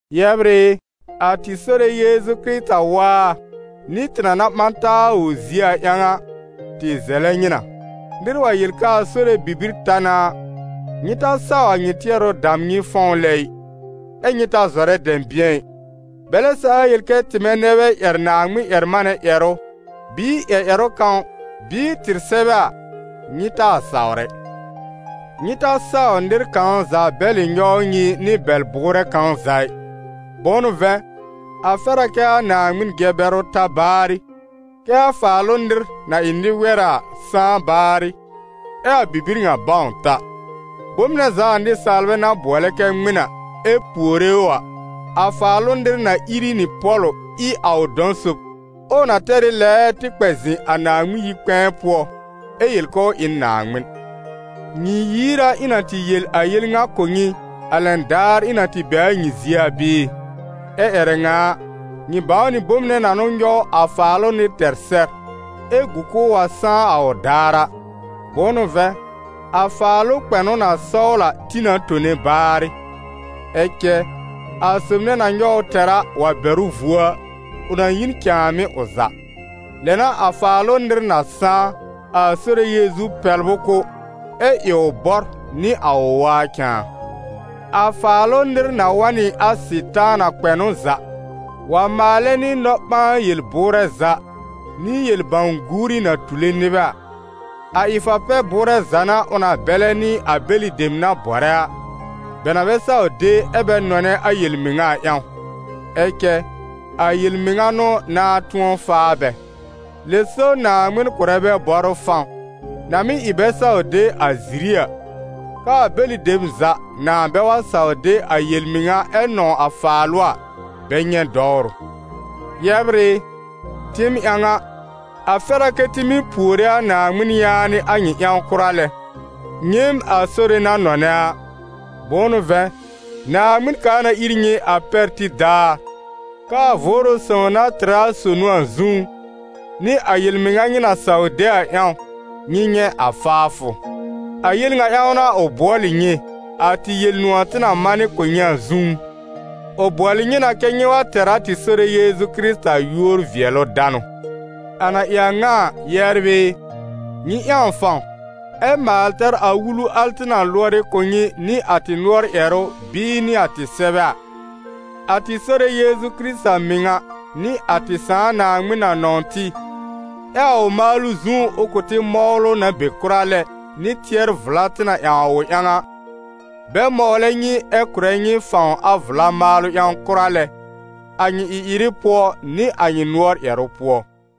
Yɛbr ɩ, a tɩ Sore Yeezu Kɩrɩta waa, nɩ tɩ na na ɓã taa a ʋ zie a ƴãw a, tɩ zɛlɛ nyɩ na: nɩr wa yel k'aa Sore bibir ta na a, nyɩ ta saw a nyɩ tɩɛrʋ dam nyɩ fɔ̃w lɛ ɩ, ɛ́ nyɩ ta zɔrɛ dɛ̃bɩ̃ɛ ɩ; bɛlɛ saa yel kɛ tɩmɛ nɛ bɛ ƴɛr Naaŋmɩn-ƴɛr-manɛ ƴɛrʋ bɩɩ ƴɛr ƴɛrʋ kãw bɩɩ tɩr sɛbɛ a, nyɩ taa sawr ɛ. Nyɩ ta saw nɩr kãw za bɛlɩ nyɔw nyɩ nɩ bɛl-bʋʋrɛ kãw za ɩ. Bʋ̃ʋ n'ʋ vɛ̃, a fɛr a kɛ́ a Naaŋmɩn jɛ-bɛrʋ ta baarɩ, kɛ́ a Faalʋ nɩr, na ɩ nɩ-wɛra a, sãá baarɩ, ɛ a bibir ŋa bãw ta. Bom nɛ za a nɩsaalbɛ na bʋɔlɛ kɛ ŋmɩn a, ɛ puore ʋ a, a Faalʋ nɩr na ìr ɩ nɩ pɔ̀lʋ ɩ a ʋ dɔ̃ sob, ɛ ʋ na tɛr ɩ lɛɛɛ tɩ kpɛ zɩ̃ a Naaŋmɩn yi-kpɛ̃ɛ pʋɔ, ɛ yel k'ʋʋ ɩ n Naaŋmɩn. Nyɩ yiir a ɩ̃ na tɩ yel a yel ŋa kʋ̀ nyɩ, a lɛn daar ɩ̃ na tɩ be a nyɩ zie a bɩɩ? Ɛ ƴɛrɛ ŋa a, nyɩ bãwnɩ bom nɛ na n'ʋ nyɔw a Faalʋ nɩr tɛr sɛr, ɛ gu k'ʋʋ wa sãá a ʋ daar a. Bʋ̃ʋ n'ʋ vɛ̃, a faalʋ kpɛnʋ na sɔwl a tĩ na tone baarɩ; ɛ cɛ a sob nɛ na nyɔw ʋ tɛr a, wa bɛr ʋ vuo a, ʋ na yi n cãàmɩ́ ʋ za. Lɛ n'a a Faalʋ nɩr na sãá, a Sore Yeezu pɛbl ʋ kʋ́, ɛ ɩ ʋ bɔr nɩ a ʋ waa cãa. A Faalʋ nɩr na wa n nɩ a Sɩtaana kpɛnʋ za, wa maalɛ nɩ nɔ-ɓãa-yel-bʋʋrɛ za nɩ yel-bãw-guuri na tule nɩbɛ a; a ɩ-fa-pɛ-bʋʋrɛ za n'a ʋ na bɛlɛ nɩ a bɛlɩ dem na bɔrɛ a, bɛ na bɛ saw de ɛ bɛ nɔnɛ a yel-mɩŋa a ƴãw, ɛ cɛ a yel-mɩŋa n'ʋ nãá tʋ̃ɔ faa bɛ. Lɛ so Naaŋmɩn kʋ̀rɛ bɛ bɔrʋ fãw, na mɩ́ ɩ bɛ saw de a ziri a, k'aa bɛlɩ dem za nãà bɛ wa saw de a yel-mɩŋa ɛ nɔ̃w a faalʋ a, bɛ nyɛ̃ dɔwrʋ. Yɛbr ɩ, tɩɩm ƴãw a, a fɛr a kɛ́ tɩ mɩ́ puore a Naaŋmɩn yaanɩ a nyɩ ƴãw kʋra lɛ, nyɩɩm a Sore na nɔnɛ a. Bʋ̃ʋ n'ʋ vɛ̃, Naaŋmɩn kaa na ir nyɩ a pɛr tib daar, k'aa Vʋʋrʋ Sõw na tɩrɛ a sonu a zũú, nɩ a yel-mɩŋa nyɩ na saw de a ƴãw, nyɩ nyɛ̃ a faafʋ. A yel ŋa ƴãw n'a ʋ bʋɔlɩ nyɩ, a tɩ Yel-nʋ̃ɔ̀ tɩ na manɩ kʋ̀ nyɩ a zũú; ʋ bʋɔlɩ nyɩ na kɛ́ nyɩ wa tɛr a tɩ Sore Yeezu Kɩrɩta yúor-vɩɛlʋ-danʋ. A na ɩ a ŋa a, yɛbr ɩ, nyɩ ƴãw fãw, ɛ maal tɛr a wulu al tɩ na lʋɔrɩ kʋ̀ nyɩ nɩ a tɩ nʋɔr ƴɛrʋ bɩɩ nɩ a tɩ sɛbɛ a. A tɩ Sore Yeezu Kɩrɩta mɩŋa nɩ a tɩ Sãà Naaŋmɩn na nɔ̃w tɩ, ɛ a ʋ maalʋ zũú ʋ kʋ̀ tɩ mɔwlʋ na be kʋra lɛ nɩ tɩɛr-vla tɩ na ƴãw a ʋ ƴãw a, bɛ mɔwlɛ nyɩ ɛ kʋ̀rɛ nyɩ fãw a vla maalʋ ƴãw kʋra lɛ a nyɩ ɩ-ɩrɩ pʋɔ, nɩ a nyɩ nʋɔr ƴɛrʋ pʋɔ.